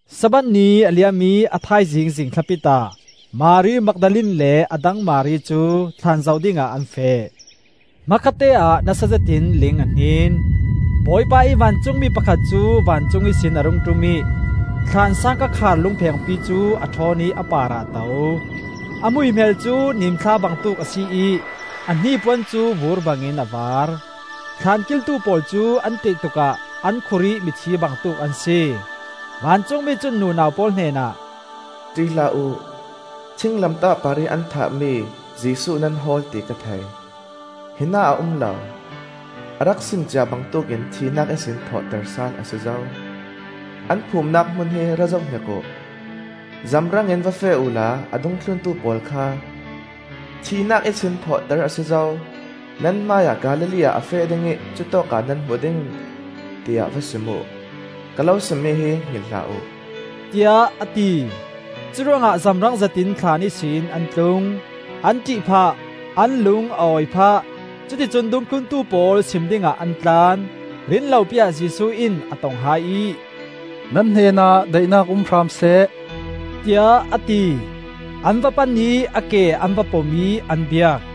Sabbath ni a liam ih a thaizing zingthlapit ah Mari Magdalene le a dang Mari cu thlaan zoh dingah an feh. Hmakhatteah nasa zet in ling a hnin. Bawipa ih vancungmi pakhat cu vancung ihsin a rung ṭum ih thlaan sangka khar lungphengpi cu a ṭhawn ih a parah a to. A hmuihmel cu nimthla bangtuk a si ih a hnipuan cu vur bangin a vaar. Thlan kiltu pawl cu an ṭih tukah an khur ih mithi bangtuk an si. Vancungmi cun nunau pawl hnenah, “ṭih hlah uh; thinglamtah parih an thahmi Jesuh nan hawl ti ka thei. Hinah a um lo, a rak simcia bangtuk in thihnak ihsin thawhter sal a si zo. An phumnak hmun hi ra zohhnik uh. Zamrang in va feh uhla a dungthluntu pawl kha ‘Thihnak ihsin thawhter a si zo; nan hmaiah Galilee ah a feh ding ih cutawkah nan hmu ding!’ tiah va sim uh. Ka lo simmi hi hngilh hlah uh,” tiah a ti. Curuangah zamrang zetin thlaan ihsin an tlung; an ṭih phah, an lung a awi phah, cuticun dungthluntu pawl sim dingah an tlan. Rinlopi-ah Jesuh in a tong hai ih, “Nan hnenah daihnak um hram seh,” tiah a ti. An va pan ih a ke an va pom ih an biak.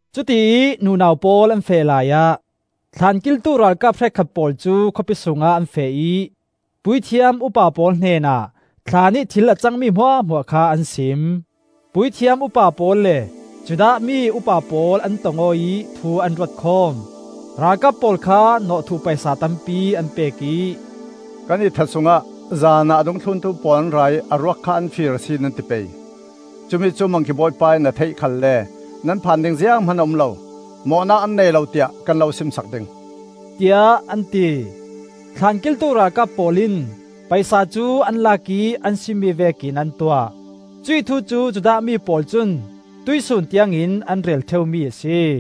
Cutiih nunau pawl an feh laiah, thlaan kiltu ralkap hrekkhat pawl cu khawpi sungah an feh ih puithiam upa pawl hnenah thlaan ih thil a cangmi hmuahhmuah kha an sim. Puithiam upa pawl le Judah mi upa pawl an tong aw ih thu an ruatkhawm. Ralkap pawl kha nawhthuh paisa tampi an pek ih, “Kan ihthat sungah zanah a dungthluntu pawl an ra ih a ruak kha an fir a si, nan ti pei. Cumi cu Mangki bawipa in a theih khalle nan phan ding zianghman a um lo, mawhnak an nei lo tiah kan lo simsak ding,” tiah an ti. Thlan kiltu ralkap pawl in paisa cu an lak ih an simmi vekin an tuah. Cuih thu cu Judah mi pawl cun tuihsun tiangin an rel ṭheumi a si.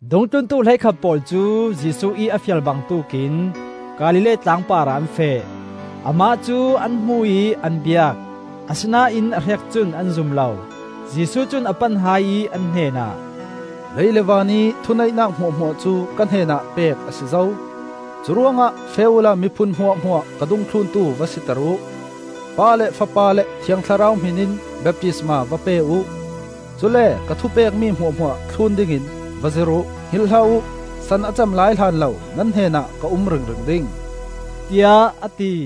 Dungthluntu hleikhat pawl cu Jesuh ih a fial bangtuk in Galilee tlang parah an feh. Amah cu an hmu ih an biak, asinain a hrek cun an zum lo. Jesuh cun a pan hai ih an hnenah, “Lei le vanih thuneihnak hmuahhmuah cu ka hnenah pek a si zo. Curuangah feh uhla miphun hmuahhmuah ka dungthluntu va siter uh; Pa le Fapa le Thiang Thlarau hmin in baptisma va pe uh. Cule ka thupekmi hmuahhmuah thlun dingin va zirh uh. Hngilh hlah uh, san a cem lai hlanlo nan hnenah ka um ringring ding,” tiah a ti.